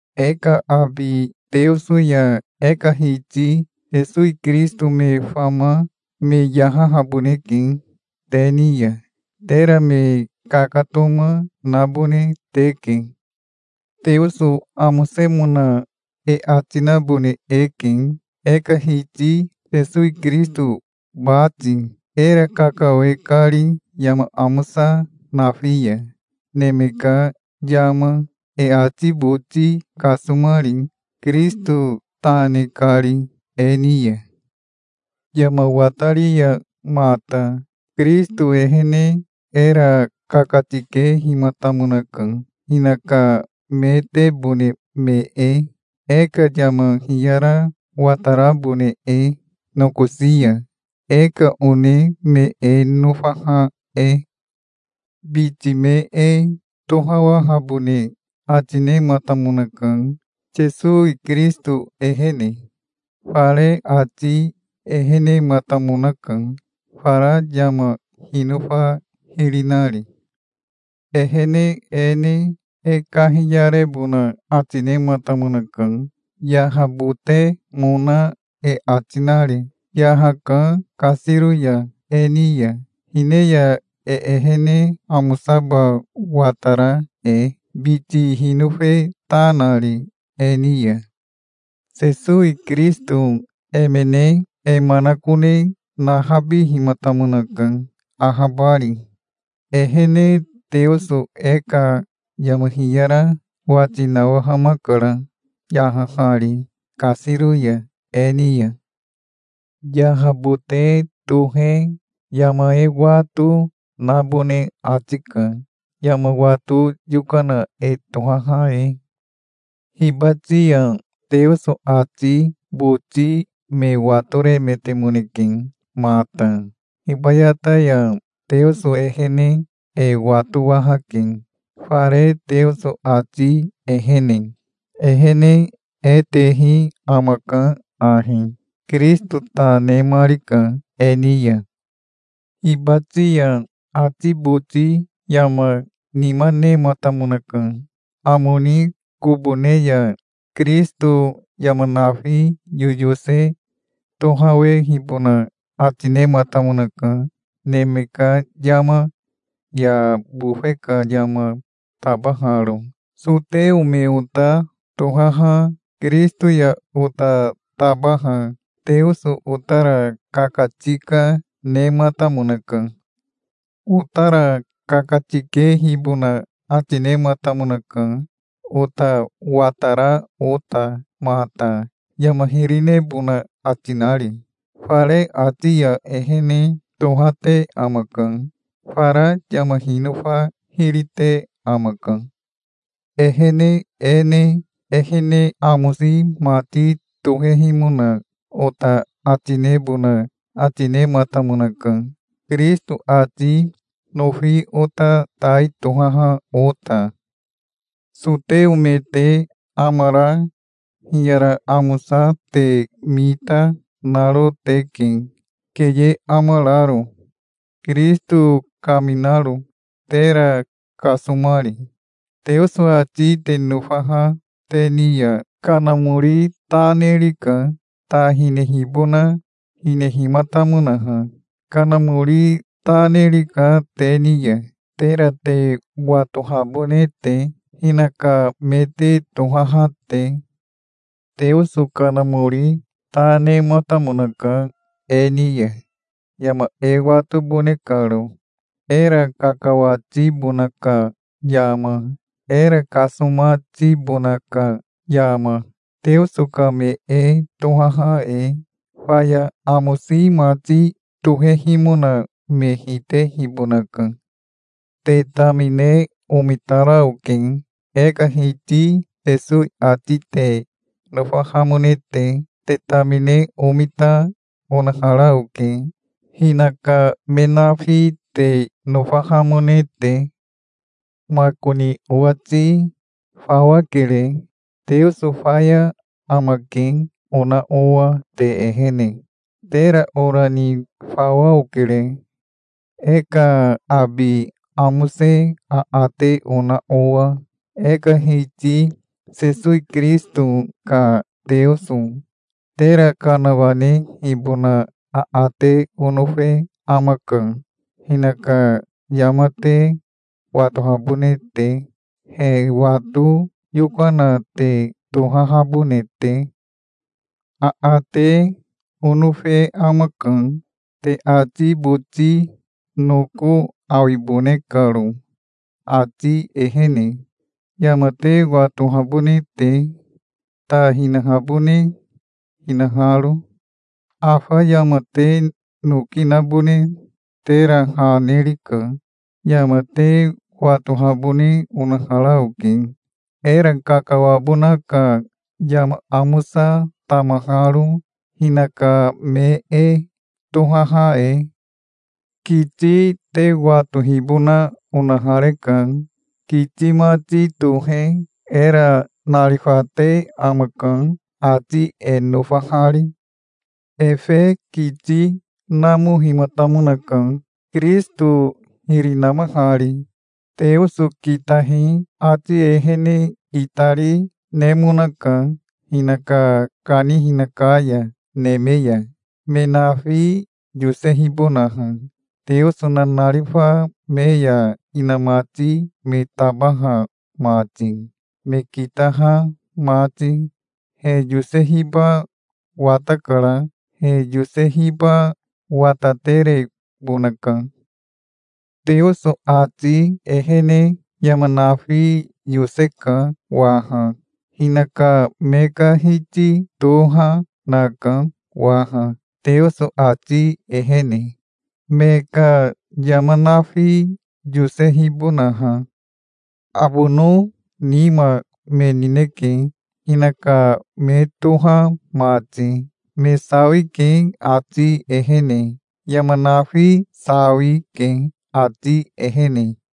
E ka abi Teoso ya e ka Hiti Sesowi Kirisito me fama me yahahaboneke te ni ya. Tera me kakatoma nabone teke. Teoso amosemona e ati nabone eke, e ka Hiti Sesowi Kirisito bati, era kakawe kari yama amosa nafi ya, neme ka yama, e ati boti kasomari, Kirisito ta ne kari e ni ya. Yama watari ya mata Kirisito ehene era kakatikehimatamonaka, hinaka metebone me e, e ka yama hiyara watarabone e, nokosi ya, e ka one me e nofaha e. Biti me e tohawahabone ati nematamonaka, Sesowi Kirisito ehene. Fare ati ehenematamonaka, fara yama hinofa hiri nari. Ehene e ne e kahiyarebona ati nematamonaka, yahabotemona e ati nari. Yahaka kasiro ya e ni ya, hine ya, e ehene amosaba watara e, biti hinofe ta nari e ni ya. Sesowi Kirisito emene e manakone nahabihimatamonaka, ahabari. Ehene Teoso e ka yama hiyara wati nawahamakara, yahahari kasiro ya e ni ya. Yahabote tohe yama e wato, nabone ati ka, yama wato yokana e tohaha e. Hibati ya Teoso ati boti me watoremetemoneke mata. Hibayata ya Teoso ehene e watowahake, fare Teoso ati ehene. Ehene e tehi amaka ahi: Kirisito ta nemarika e ni ya. Hibati ya ati boti yama nima nematamonaka. Amo ni kobo ne ya Kirisito yama nafi yoyose tohawehibona ati nematamonaka, neme ka yama ya bofe ka yama tabaharo Soteo me ota tohaha Kirisito ya ota tabaha Teoso otara kakatika nematamonaka. Otara kakatikehibona ati nematamonaka ota watara ota mata, yama hiri nebona ati nari. Fare ati ya ehene tohate amaka. Fara yama hinofa hiri te amaka. Ehene e ne ehene amosi mati tohehimona ota ati nebona ati nematamonaka, Kirisito ati nofi ota tai tohaha ota. Soteo me te amara hiyara amosa te mita, naro teke, keye amararo, Kirisito kaminaro, tera kasomari. Teoso ati te nofaha te ni ya Kanamori ta nerika, ta hinehibona hinehimatamonaha. Kanamori ta nerika te ni ya, tera te watohabone te, hinaka me te tohaha te. Teoso Kanamori ta nematamonaka e ni ya, yama e watobone karo, era kakawatibona ka yama, era kasomatibona ka yama, Teoso ka me e tohaha e. Faya amosi mati tohehimona me hitehibonaka. Te tamine omitara oke, e ka Hiti Sesowi ati te nofahamone te. Te tamine omita, onahara oke, hinaka me nafi te nofahamone te. Makoni owati fawa kere, "Teoso faya amake", ona owa te ehene. Tera ora ni fawa okere, e ka abi amose aate ona owa, e ka Hiti Sesowi Kirisito ka Teoso. Tera kanawanehibona aate onofe amaka, hinaka yama te watohabone te, he wato yokana te tohahabone te. Aate, onofe amaka, te ati boti noko awibone karo ati ehene, yama te watohabone te, ta hinahabone hinaharo. Afa yama te noki nabone tera ha nerika. Yama te watohabone onahara oke, era kakawabona ka yama amosa, tamaharo, hinaka me e tohaha e. Kiti te watohibona onahareka. Kiti mati tohe era narifate amaka, ati e nofahari. Efe kiti namohimatamonaka, Kirisito hiri namahari. Teoso kitahi ati ehene itari, nemonaka hinaka kanihina ka ya neme ya, me nafi yosehibonaha, Teoso nanarifa me ya inamati me tabaha mati, me kitaha mati. He yosehiba watakara. He yosehiba wataterebonaka. Teoso ati ehene yama nafi yoseka waha. Hinaka me ka Hiti toha naka waha Teoso ati ehene, me ka yama nafi yosehibonaha. Abono nima me nineke, hinaka me toha mati. Me sawike ati ehene. Yama nafi sawike ati ehene.